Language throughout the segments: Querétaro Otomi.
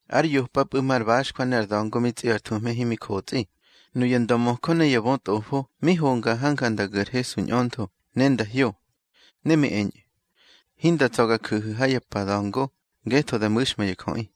Ár yopapꞌu̱ mar baxjwa ne ar da̱ngo mi tsꞌi ar thuhme himi jotsꞌi, nuya ndömöjö ne ya bötꞌofo mi honga hanja nda gu̱ ar Hesu ñꞌöntho, ne nda hyo. Ne mi eñꞌu̱: —Hinda tsa̱ ga ju̱hu̱ ha ya pa da̱ngo, ngetho da mu̱xma ya jöꞌi.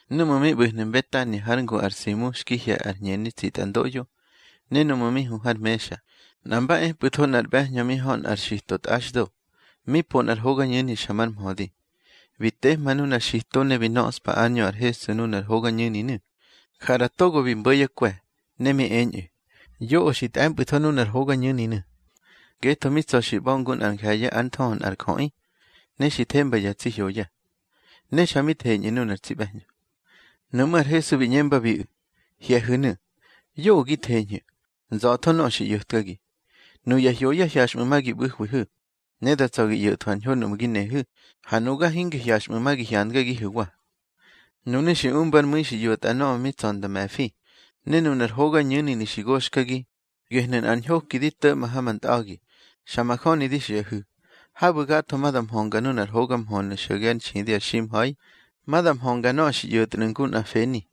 Nu mi ꞌbu̱hnu̱ Mbetania hár ngu ar Simu xki hye̱ ar hñeni tsitꞌandoꞌyo, ne núꞌmu̱ mi hu har mexa, nꞌa mba epꞌu̱tho nꞌar ꞌbe̱hñö mi hö nꞌar xito tꞌaxdo, mi po nꞌar hogañu̱ni xa mar mhödi. Bi tehma nunar xito ne bi nöꞌspa ár ñö ar Hesu nunar hogañu̱ninu̱. Ja ꞌra togo bi mbo̱ yá kwe̱, ne mi eñꞌu̱: —Yoꞌö xi tꞌe̱mpꞌu̱tho nunar hogañu̱ninu̱. Ngetho mi tsa̱ xi ꞌba̱ ngu nꞌa nje̱ye̱ ár nthöhö nꞌar jöꞌi, ne xi themba ya tsi hyoya. Ne xa mi theñꞌu̱ nuna tsi ꞌbe̱hñö. Nuꞌmú̱ ar Hesu bi ꞌñembabiꞌu̱: —Hye̱hu̱nu̱. Yoꞌö gi theñhu̱. Nza̱tho nöꞌö xi ꞌyo̱tkagi. Nuya hyoya hyaxꞌmu̱ ma gi ꞌbu̱hwihu̱, ne da tsa̱ gi ꞌyo̱thwu̱ ar ñho nuꞌmu̱ gi nehu̱. Ha nuga hinge hyaxꞌmu̱ ma gi hyandgagihu̱wa. Nunu̱ xi umbár mu̱i xi ꞌyo̱tꞌa nöꞌö mi tsa̱ nda me̱fi. Ne nunar hogañu̱ninu̱ xi goxkagi, gehnu̱ nꞌar ñhoki di to̱ꞌma ha ma ntꞌa̱gi. Xa majöni di xiꞌahu̱, habu̱ gatho ma da mhönga nunar hoga mhönu̱ xo̱ge ár nxidi ar ximha̱i, ma da mhönga nöꞌö xi ꞌyo̱tnu̱ ngu nꞌar feni.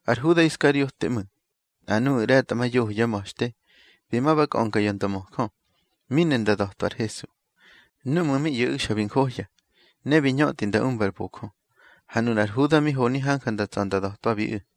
Ar Huda Iskariote ꞌmu̱, nꞌa nuꞌu̱ ꞌre̱tꞌamayoho yá ma̱xte, bi ma ba kꞌönga ya ndömöjö, mi ne nda da̱twa ar Hesu. Núꞌmu̱ mi ꞌyo̱ꞌu̱ xa bi njohya, ne bi ñötꞌi nda umba ar bojö. Ha nunar Huda mi honi hanja nda tsa̱ nda da̱twabiꞌu̱.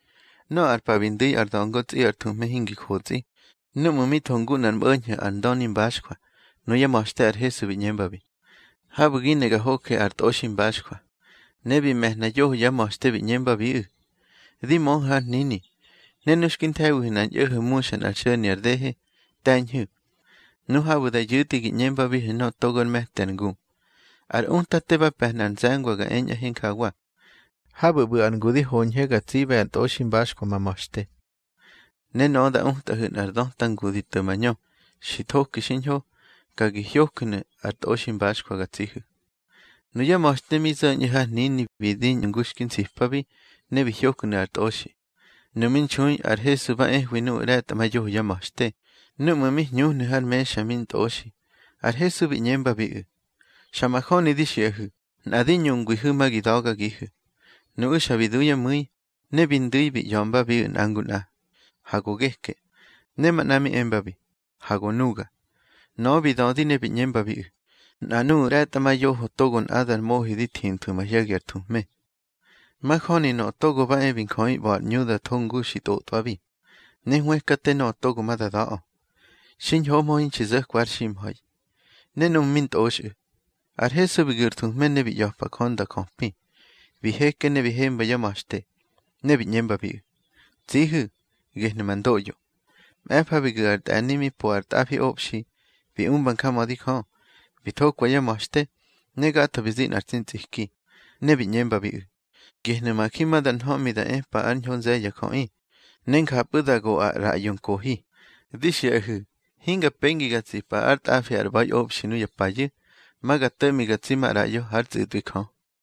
Nöꞌö ar pa bi ndu̱i ar da̱ngo tsꞌi ar thuhme hinxi jotsꞌi, núꞌmu̱ mi tho ngu nꞌar mꞌo̱ñho̱ ar ndöni mbaxjwa, nuyá ma̱xte ar Hesu bi ꞌñembabi: —Habu̱ gi ne ga hoje ar tꞌoximbaxjwa. Ne bi me̱hna yoho yá ma̱xte, bi ꞌñembabiꞌu̱: —Di möhu̱ har hnini, ne nu xki nthe̱wihu̱ nꞌar ñꞌo̱ho̱ muxa nꞌar xo̱ni ar dehe, te̱ñhu̱. Nu habu̱ da yu̱tꞌi, gi ꞌñembabihu̱ nöꞌö togo ár me̱ti ar ngu: Ar Utate ba pe̱hna ar nze̱ngwa ga eñꞌahe njawa: Habu̱ ꞌbu̱ ar ngu di hoñhe ga tsiꞌbe ar tꞌoximbaxjwa ma ma̱xte. Ne nöꞌö ma da utꞌahu̱ nꞌar döta ngu di to̱ mañö, xi thoki xiñho. Ka gi hyoju̱nu̱ ar tꞌoximbaxjwa ga tsihu̱. Nuyá ma̱xte mi zo̱ñꞌu̱ har hnini, bi diñꞌu̱ ngu xki nsipabi, ne bi hyoknu̱ ar tꞌoxi. Nu mi nxui ar Hesu ba ehwi nuꞌu̱ ꞌre̱tꞌamayoho yá ma̱xte. Núꞌmu̱ mi hñuhnu̱ har mexa mi ntꞌoxi, ar Hesu bi ꞌñembabiꞌu̱: —Xa majöni di xiꞌahu̱, nꞌa di ñungwihu̱, ma gi da̱gagihu̱. Nuꞌu̱ xa bi du yá mu̱i, ne bi ndu̱i bi ꞌya̱mbabiꞌu̱ nꞌa ngu nꞌa: —Ha go geke. Ne manꞌa mi embabi: —Ha go nuga. Nöꞌö bi dödi ne bi ꞌñembabiꞌu̱: —Nꞌa nuꞌu̱ ꞌre̱tꞌamayoho togo nꞌadar mohi di thinthwu̱ mahye̱gi ar thuhme. Majöni Nöꞌö Togo ba e bi Njöꞌi ꞌba̱ ar ꞌñu da tho ngu xi tꞌotꞌwabi, ne hwëkate nöꞌö togo ma da da̱ꞌö. Xiñhohmö hinxi zo̱kwa har ximha̱i. Ne núꞌmu̱ mi ntꞌoxꞌu̱, ar Hesu bi gu̱ ar thuhme ne bi ꞌya̱pa Jö nda jöpi. Bi heke bi hemba yá ma̱xte, ne bi ꞌñembabiꞌu̱: —Tsihu̱; gehnu̱ ma ndoꞌyo. Mꞌe̱fa bi gu̱xa ar tꞌe̱ni mi po ar tꞌafiꞌobxi, bi umba njamödi Jö, bi thokwa yá ma̱xte, ne gatho bi zi nꞌa tsi ntsꞌiki. Ne bi ꞌñembabiꞌu̱: —Gehnu̱ ma ji ma da nhöꞌmi da epa ár ñho nze̱ye̱ ya jöꞌi, ne njapꞌu̱ da go ar ꞌraꞌyo nkohi. Di xiꞌahu̱, hinga pengi ga tsipa ár tꞌafi ar ꞌba̱iꞌobxi nuya payu̱. Ma ga to̱ꞌmi ga tsi maꞌraꞌyo hár tsꞌu̱tꞌwi Jö.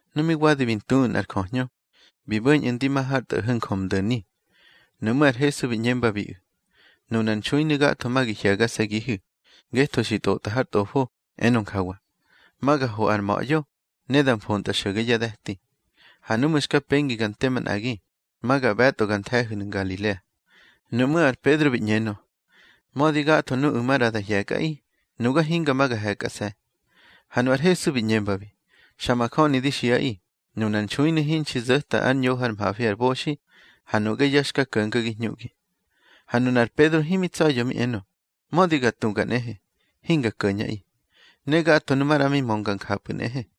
Nu mi wadi bi ntuꞌu̱ nꞌar jöhñö, bi bo̱ñꞌu̱ ndi ma har tꞌo̱ho̱ Njömdo̱ni. Nuꞌmú̱ ar Hesu bi ꞌñembabiꞌu̱: —Nunar nxuinu̱ gatho ma gi hye̱gase̱gihu̱, ngetho xi tꞌotꞌa har Tꞌofo, enö njawa: Ma ga ho ar ma̱ꞌyo, ne da mfontꞌa xo̱ge yá de̱ti. Ha núꞌmu̱ xka pengi ga nte manꞌagi, ma ga ꞌbe̱tꞌo gar nthe̱hu̱nu̱ Ngalilea. Nuꞌmú̱ ar Pedro bi ꞌñenö: —Mödi gatho nuꞌu̱ maꞌra da hye̱kꞌaꞌi, nuga hinga ma ga he̱kꞌase̱. Ha nu ar Hesu bi ꞌñembabi: —Xa majöni di xiꞌaꞌi, nunar nxuinu̱ hinxi zo̱ta ár ñoho ár mhafi ar boxi, ha nuꞌge ya xka ko̱ngagi hñuꞌgi. Ha nunar Pedro himi tsa̱ya̱ mi enö: —Mödi ga tuga nꞌehe, hinga ko̱ñꞌaꞌi. Ne gatho nu maꞌra mi mönga njapꞌu̱ nꞌehe.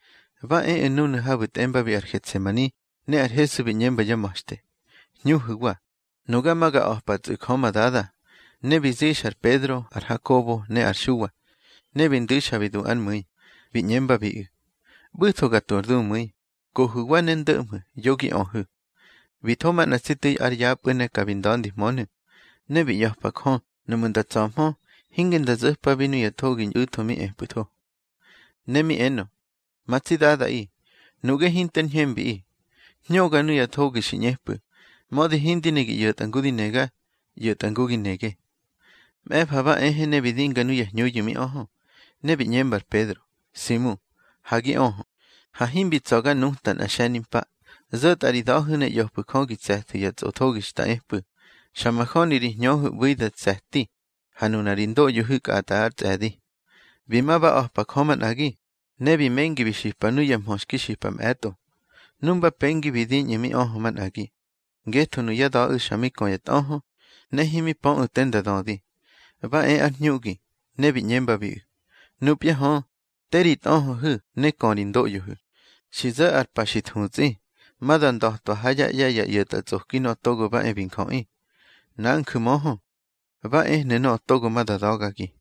Ba eꞌu̱ núnu̱ habu̱ tꞌembabi ar Getsemani, ne ar Hesu bi ꞌñemba yá ma̱xte: —Hñuhu̱wa. Nuga ma ga a̱patsꞌu̱ Jö ma Dada. Ne bi zixa ar Pedro, ar Hakobo, ne ar Xuwa, ne bi ndu̱i xa bi du ár mu̱i. Bi ꞌñembabiꞌu̱: —ꞌBu̱tho ga tu ar dumu̱i. Kohu̱wa ne ndo̱ꞌmhu̱, yo gi öhu̱. Bi tho manꞌa tsi tu̱i ár yapꞌu̱ ne ka bi nda̱ndihmönu̱. Ne bi ꞌya̱pa Jö, nuꞌmu̱ nda tsa̱hmö, hinge nda zo̱pabi nuya thogi ñꞌu̱tho mi epꞌu̱tho. Ne mi enö: —Ma tsi Dadaꞌi, nuꞌge hinter ñhembiꞌi. Hñöga nuya thogi xi ꞌñepꞌu̱. Mödi hindi ne gi ꞌyo̱tꞌa ngu di nega, ꞌyo̱tꞌa ngu gi nege. Mꞌe̱fa ba ehe ne bi dinga nuya hñuyu̱ mi öhö, ne bi ꞌñemba ar Pedro: —Simu, ha gi öhö. Ha himbi tsa̱ ga nuta nꞌa tsi xe̱nimpa. Zo̱tꞌa ri da̱hu̱ ne ꞌya̱fu̱ Jö gi tse̱thu̱ ya tsꞌothogi xta epꞌu̱. Xa majöni ri hñöhu̱ ꞌbu̱i da tse̱ti, ha nuna ri ndoꞌyohu̱ kꞌatꞌa ár tsꞌe̱di. Bi ma ba a̱pa Jö manꞌagi, ne bi mengi bi xipa nuya mhö xki xipa mꞌe̱tꞌo. Nu mba pengi bi diñꞌu̱ mi öhö manꞌagi, ngetho nuyá da̱ꞌu̱ xa mi kö ya tꞌöhö, ne himi pöꞌu̱ te nda dödi. Ba e ár hñuꞌgi, ne bi ꞌñembabiꞌu̱: —Nupya hö, te ri tꞌöhöhu̱ ne kö ri ndoꞌyohu̱. Xi zo̱ ar pa xi thutsꞌi, ma da nda̱twa ha yá ꞌye̱ ya ꞌyo̱tꞌatsꞌoki Nöꞌö Togo ba e bi Njöꞌi. Nanju̱ möhö, ba ehnu̱ nöꞌö togo ma da da̱gagi.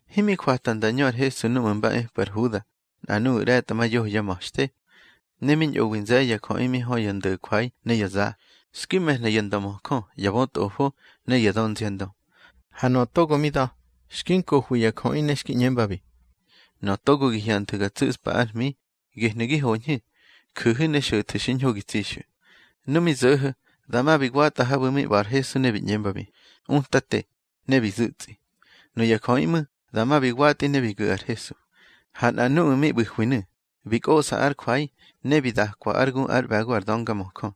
Himi jwata nda ñö ar Hesu núꞌmu̱ mba epꞌu̱ ar Huda, nꞌa nuya ꞌre̱tꞌamayoho yá ma̱xte. Ne mi ñꞌowi nze̱ye̱ ya jöꞌi mi hö ya ndo̱jwai ne ya za, xki me̱hna ya ndömöjö, ya bötꞌofo, ne ya dönziandö. Ha nöꞌö togo mi da̱, xki nkohwi ya jöꞌi ne xki ꞌñembabi: —Nöꞌö togo gi hyanthu̱ ga tsu̱spa ár hmi, gehnu̱ gi hoñhu̱. Ju̱hu̱ ne xo̱thu̱ xiñho gi tsixu̱. Nu mi zo̱ho̱, dama bi watꞌa habu̱ mi ꞌba̱ ar Hesu, ne bi ꞌñembabi: —Utate. Ne bi zu̱tsꞌi. Nuya jöꞌi ꞌmu̱, dama bi watꞌi ne bi gu̱ ar Hesu. Ha nꞌa nuꞌu̱ mi ꞌbu̱hwinu̱, bi kꞌoꞌsa ár jwai, ne bi dakwa ár gu ár ꞌbe̱go ar döngamöjö.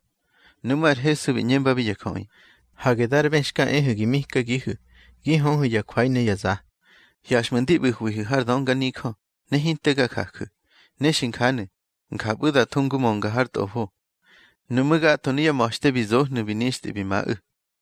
Nuꞌmú̱ ar Hesu bi ꞌñembabi ya jöꞌi: —Hage dar bë xka ehu̱ gi mikagihu̱, gi höhu̱ ya jwai ne ya za. Hyaxꞌmu̱ ndi ꞌbu̱hwihu̱ har dönganijö, ne hinte ga jaju̱. Ne xi njanu̱, njapꞌu̱ da tho ngu mönga har Tꞌofo. Nuꞌmú̱ gatho nuyá ma̱xte bi zohnu̱ bi nixtꞌi bi maꞌu̱.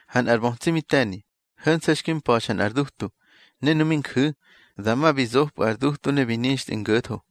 Ha nꞌar bötsi mi te̱ni, ho̱nse̱ xki mpa̱xa nꞌar dutu, ne nu mi nju̱, dama bi zopꞌu̱ ar dutu ne bi nixtꞌi ngo̱tho.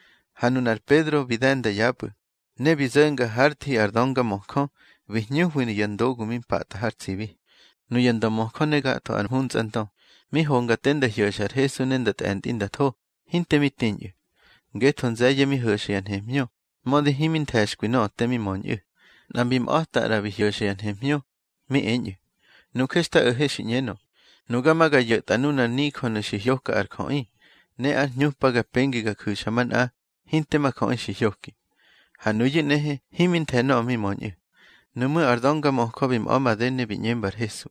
Ha nunar Pedro bi de̱nda yapꞌu̱, ne bi zo̱nga hár thi ar döngamöjö, bi hñuhwi ya ndogu mi mpatꞌa har tsibi. Nuya ndömöjö ne gatho ar mhuntsꞌandö, mi honga te nda hyo̱xa ar Hesu ne nda tꞌe̱ntꞌi nda tho, hinte mi tiñꞌu̱. Ngetho nze̱ye̱ mi ho̱xa ya nhemhñö, mödi himi nthe̱xkwi nöꞌö te mi möñꞌu̱. Nꞌa mbi mꞌa̱ta ꞌra bi hyo̱xa ya nhemhñö, mi eñꞌu̱: —Nuje xta o̱he xi ꞌñenö: Nuga ma ga yo̱tꞌa nunar nijönu̱ xi hyoka ar jöꞌi, ne ár hñupa ga pengi ga ju̱xa manꞌa, hinte ma jöꞌi xi hyoki. Ha nuyu̱ nꞌehe himi nthe̱ nöꞌö mi möñꞌu̱. Nuꞌmú̱ ar döngamöjö bi mꞌa̱ made ne bi ꞌñemba ar Hesu: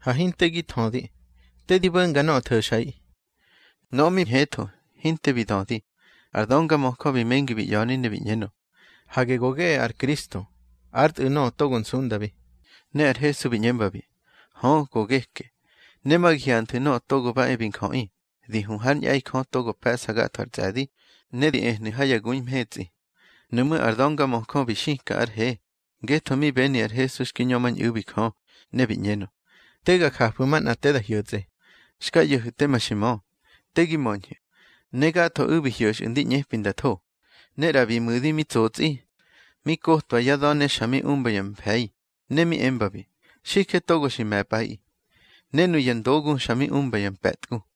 —Ha hinte gi thödi. Te di bo̱nga nöꞌö tho̱xꞌaꞌi. Nöꞌö mi ñhetho, hinte bi dödi. Ar döngamöjö bi mengi bi ꞌya̱ni ne bi ꞌñenö: —Hage go geꞌe ar Kristo, ár Tꞌu̱ nöꞌö togo nsundabi. Ne ar Hesu bi ꞌñembabi: —Hö, go geke. Ne ma gi hyanthu̱ Nöꞌö Togo ba e bi Njöꞌi di hu hár ñꞌe̱i Jö togo pe̱ꞌsa gatho ar tsꞌe̱di, ne di ehnu̱ ha ya gui mhetsꞌi. Nuꞌmú̱ ar döngamöjö bi xika ár he, ngetho mi beni ar Hesu xki ñömañꞌu̱bi Jö, ne bi ꞌñenö: —Te ga jafu̱ manꞌa te da hyo̱tsꞌe. Xka ꞌyo̱hu̱ teme xi mö. Te gi möñhu̱. Ne gathoꞌu̱ bi hyo̱xꞌu̱ ndi ꞌñepi nda tho. Ne ꞌra bi mu̱di mi tsotsꞌi. Mi kotwa yá da̱ ne xa mi umba ya mfe̱i, ne mi embabi: —Xije togo bi me̱pꞌaꞌi. Ne nuya ndogu xa mi umba ya mpe̱tgu.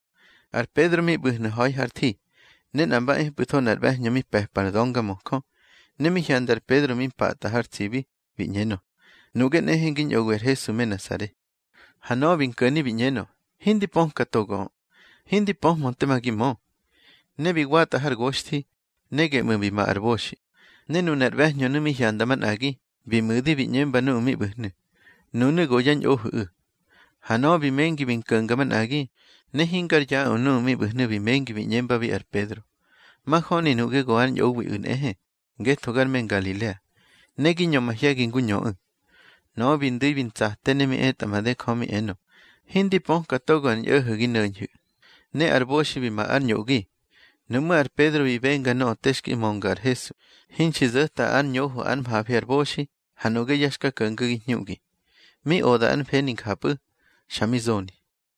Ar Pedro mi ꞌbu̱hnu̱ ha̱i har thi, ne nꞌa mba epꞌu̱tho nꞌar ꞌbe̱hñö mi pe̱pa ar döngamöjö. Ne mi hyanda ar Pedro mi mpatꞌa har tsibi, bi ꞌñenö: —Nuꞌge nꞌehe ngi ñꞌowi ar Hesu me Nasare. Ha nöꞌö bi nko̱ni bi ꞌñenö: —Hindi pöka togoꞌö. Hindi pöhmö tema gi mö. Ne bi watꞌa har goxthi. Ne geꞌmu̱ bi ma ar boxi. Ne nunar ꞌbe̱hñönu̱ mi hyanda manꞌagi, bi mu̱di bi ꞌñemba nuꞌu̱ mi ꞌbu̱hnu̱: —Nunu̱ go yá ñꞌohu̱ꞌu̱. Ha nöꞌö bi mengi bi nko̱nga manꞌagi. Ne hingar yaꞌö nuꞌu̱ mi ꞌbu̱hnu̱ bi mengi bi ꞌñembabi ar Pedro: —Majöni nuꞌge go ár ñꞌowiꞌu̱ nꞌehe, ngetho gar me Ngalilea, ne gi ñö mahye̱gi ngu ñöꞌu̱. Nöꞌö bi ndu̱i bi ntsate ne mi etꞌa made Jö, mi enö: —Hindi pöka togo ar ñꞌo̱ho̱ gi no̱ñhu̱. Ne ar boxi bi ma ár ñoꞌgi. Nuꞌmú̱ ar Pedro bi benga nöꞌö te xki mönga ar Hesu: Hinxi zo̱ta ár ñoho ár mhafi ar boxi, ha nuꞌge ya xka ko̱ngagi hñuꞌgi. Mi oda ár mfeni njapꞌu̱, xa mi zoni.